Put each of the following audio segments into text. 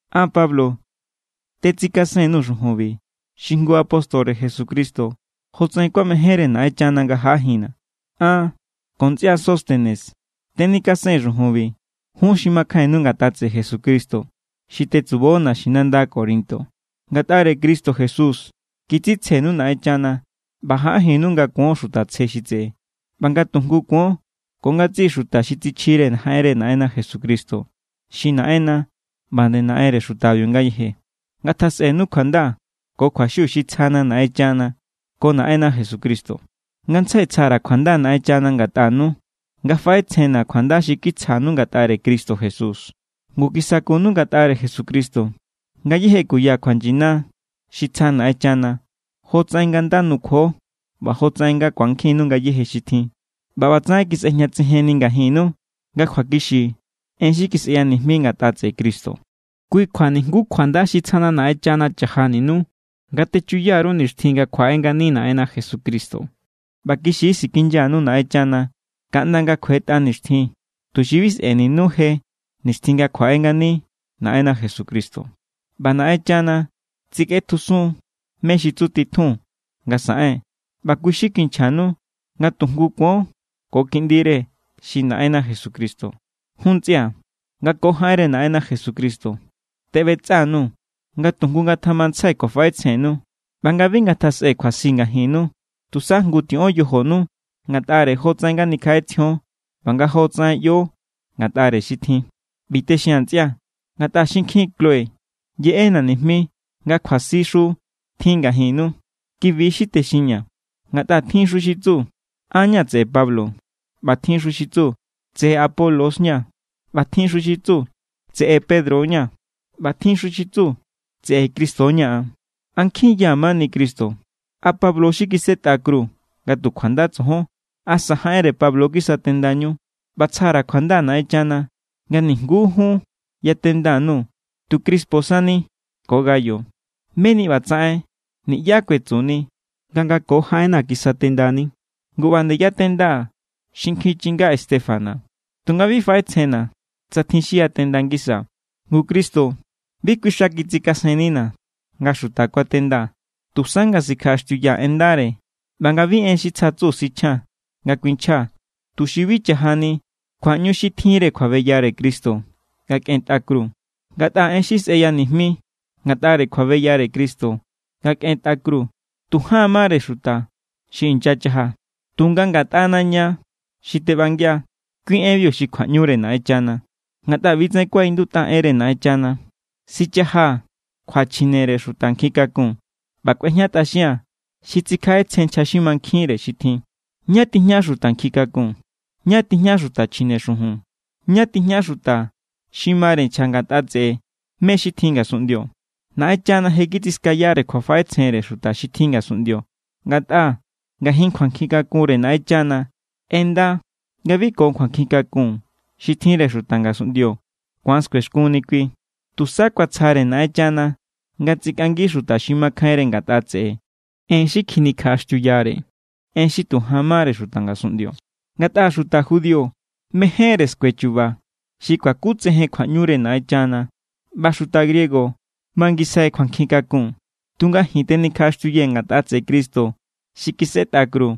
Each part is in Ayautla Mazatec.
An, Pablo, tetsikasen_nuu̱ xujunbi, xi jngu apóstore Jesucristo jotsaꞌen kuamejénre Naꞌenchana nga jaꞌajinna̱. An ko ntsꞌia Sóstenes tenikasee̱n xujunbi. Jun xi makjainnu ngatꞌa tseꞌe Jesucristo xi tetsubo naxinanda Corinto, ngatꞌare Cristo Jesús kitsitsjenu Naꞌenchana ꞌba jaꞌajinnu nga kuon xuta tsje xi tseꞌe, ꞌba nga tu jngu kuon ko ngatsiꞌi xuta xi tsichjire jaꞌenre Naꞌenna Jesucristo. Xi Naꞌenna ꞌba nde Naꞌenre xutabiu ngayeje. Ngatjasꞌenu kjuanda ko kjuaxiu xi tsjana Naꞌenchana ko Naꞌenna Jesucristo. Ngantsjai tsja_ra̱ kjuanda Naꞌenchana ngatꞌanu, nga faꞌetsjenna̱ kjuanda xi kitsjanu ngatꞌare Cristo Jesús. Ngu kisakunu ngatꞌare Jesucristo ngayéje kuya kjuanyina xi tsja Naꞌenchana, jotsaꞌen nga nda nukjuo ꞌba jotsaꞌen nga ku̱ankjinnu ngayéje xi tjin. ꞌBa ꞌbatsaꞌen kisꞌejñatsejenni ngajinnu nga kjuakixi en xi kisꞌeya nijmi ngatꞌa tseꞌe Cristo. Kui kjua nijnguú kjuanda xi tsjana Naꞌenchana chajaninu nga techuya_ru nixtjin nga kjuaꞌe ngani Naꞌenna Jesucristo. ꞌBa kixi= sikinyanu Naꞌenchana kaꞌnda nga kjuetꞌa nixtjin, tuxi bi sꞌe̱ninu je nixtjin nga kjuaꞌe ngani Naꞌenna Jesucristo. ꞌBa Naꞌenchana tsikꞌetjusun= mé= xi tsutitjun nga saꞌen, ꞌba kui= xi kinchjanu nga tu jngu kuon ko Kiꞌndire, xi Naꞌenna Jesucristo. Jun ntsꞌia̱, nga ko jaꞌenre Naꞌenna Jesucristo teꞌbetsꞌa_nuu̱ nga tujngu ngatjamantsjai kjuafaꞌetsjennu ꞌba nga bi ngatjasꞌe kjuasi ngajinnu. Tusa jngu tiꞌon yojonu ngatꞌare jotsaꞌen nga nikjaꞌetsjion ꞌba nga jotsaꞌen ꞌyo ngatꞌare xi tjin. ꞌBi texia̱n, ntsꞌia̱, ngatꞌa xinkjin Cloé yeꞌena̱ nijmi nga kjuasixu tjin ngajinnu. Kibi= xi texinña̱ ngatꞌa tjinxu xi tsu: “An= ña̱ tseꞌe Pablo.” ꞌBa tjinxu xi tsu: “Tseꞌe Apolos= ña̱.” ꞌBa tjinxu xi tsu: “Tseꞌe Pedro= ña̱.” ꞌBa tjinxu xi tsu: “Tseꞌe Cristo= ña̱ an.” ¿A nkjin= ya mani Cristo? ¿A Pablo= xi kisꞌetꞌa kru nga tu kjuanda tsojon? ¿Asa jaꞌenre Pablo kisatendañú? ꞌBa tsja_ra̱ kjuanda Naꞌenchana nga nijnguú jun yatenda_nuu̱, tu Crispo sani ko Gayo. Meni ꞌbatsaꞌen niꞌyá kuetsuni nga nga ko jaꞌenna̱ kisatendani. Ngu, ꞌba=nde yatendaa̱ xinkjin chinga Estéfanas. Tunga bi faꞌetsjenna̱ tsa tjin xi yatenda ngisaa̱. Ngu Cristo bi kui xa kitsikasennina̱ nga xuta kuatendaa̱, tusa nga sikjaꞌaxtiuyaa̱ en ndare ꞌba nga bi en xi tsjatsu sichjaa̱n nga kuinchjaa̱, tuxi bi cha̱jani kjuaꞌñu xi tjinre kjuabeyare Cristo nga kꞌentꞌa kru. Ngatꞌa en xi sꞌeya nijmi ngatꞌare kjuabeyare Cristo nga kꞌentꞌa kru, tu jaan mare xuta xi inyachaja. Tunga ngatꞌana ña xi teꞌbangia, kui enbiu xi kjuaꞌñure Naꞌenchana. Ngatꞌa ꞌbi= tsaꞌen kuaꞌindutꞌa enre Naꞌenchana: “Sichajaa̱ kjuachjinere xuta nkjin kakun, ꞌba kꞌuejñatꞌaxia̱n xi tsikjaꞌetsjen nchja xi mankjinre xi tjin.” ¿Ñá tijña xuta nkjin kakun? ¿Ñá tijña xuta chjine xujun? ¿Ñá tijña xuta xi mare nchja ngatꞌa tseꞌe mé= xi tjin ngasunꞌndio? Naꞌenchana je kitsiskayare kjuafaꞌetsjenre xuta xi tjin ngasunꞌndio. Ngatꞌa ngajin kjuankjin kakunre Naꞌenchana ꞌenda nga bi ko kjuankjin kakun xi tjinre xuta ngasunꞌndio ku̱an skuexkunni kui. Tusa kuatsjare Naꞌenchana nga tsikꞌangi xuta xi makjainre ngatꞌa tseꞌe en xi kjinikjaꞌaxtiuyare, en xi tu jan mare xuta ngasunꞌndio. Ngatꞌa xuta judío mejénre skue chu̱ba̱ xi kuakutsejen kjuaꞌñure Naꞌenchana, ꞌba xuta griego mangisjai kjuankjin kakun. Tunga ji̱n tenikjaꞌaxtiuyee̱ ngatꞌa tseꞌe Cristo xi kisꞌetꞌa kru.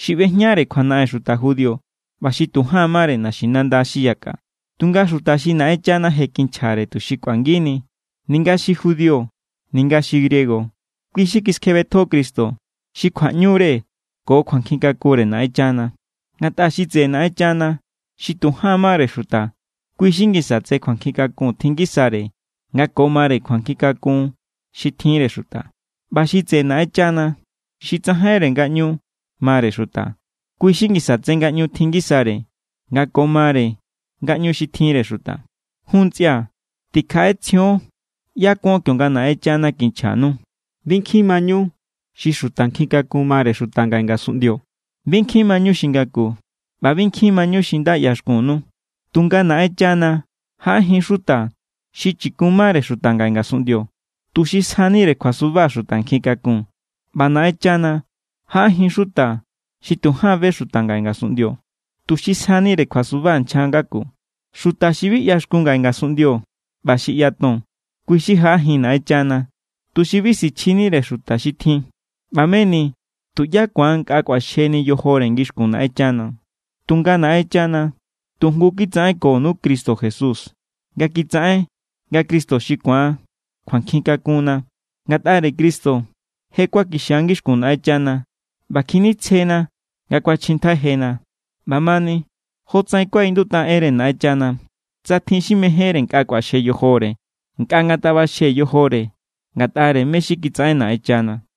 Xi ꞌbejñare kjuanaꞌen xuta judío ꞌba xi tu jaan mare naxinanda xi yakꞌa. Tunga xuta xi Naꞌenchana je kinchjare tuxi kꞌuangini, ninga xi judío, ninga xi griego, kui= xi kiskjebetjo Cristo xi kjuaꞌñure ko kjuankjin kakunre Naꞌenchana. Ngatꞌa xi tseꞌe Naꞌenchana xi tu jaan mare xuta, kui= xi ngisa tse kjuankjin kakun tjin ngisare nga ko mare kjuankjin kakun xi tjinre xuta. ꞌBa xi tseꞌe Naꞌenchana xi tsajainre ngaꞌñu mare xuta, kui= xi ngisa tse ngaꞌñu tjin ngisare nga ko mare ngaꞌñu xi tjinre xuta. Jun, ntsꞌia̱, tikjaꞌetsjion ꞌyá kuon kionga Naꞌenchana kinchjanu. Bi nkjin mañu xi xuta nkjin kakun mare xuta ngaꞌe ngasunꞌndio. Bi nkjin mañu xi ngaku, ꞌba bi nkjin mañu xi nda ꞌyaxkunnu. Tunga Naꞌenchana jaꞌajin= xuta xi chikun mare xuta ngaꞌe ngasunꞌndio, tuxi sjanire kjuasuba xuta nkjin kakun. ꞌBa Naꞌenchana jaꞌajin= xuta xi tu jaan be xuta ngaꞌe ngasunꞌndio, tuxi sjanire kjuasuba nchja ngaku. Xuta xi bi ꞌyaxkun ngaꞌe ngasunꞌndio ꞌba xi ꞌyaton, kui= xi jaꞌajin Naꞌenchana, tuxi bi sichjinire xuta xi tjin. ꞌBa meni tuꞌyá ku̱an nkꞌa kꞌuaxjeni yojore ngixkun Naꞌenchana. Tunga Naꞌenchana tu jngu kitsaꞌenkonu Cristo Jesús ꞌba kitsaꞌen nga Cristo xi ku̱an kjuankjin kakunna. Ngatꞌare Cristo je kuakixia ngixkun Naꞌenchana ꞌba kjinitsjena ꞌba kuachjintjai jena. ꞌBamani, jotsaꞌen kuaꞌindutꞌa enre Naꞌenchana: “Tsa tjin xi mejénre nkꞌa kꞌuaxje yojore, nkꞌa ngatjaꞌbaxje yojore ngatꞌare mé= xi kitsaꞌen Naꞌenchana.”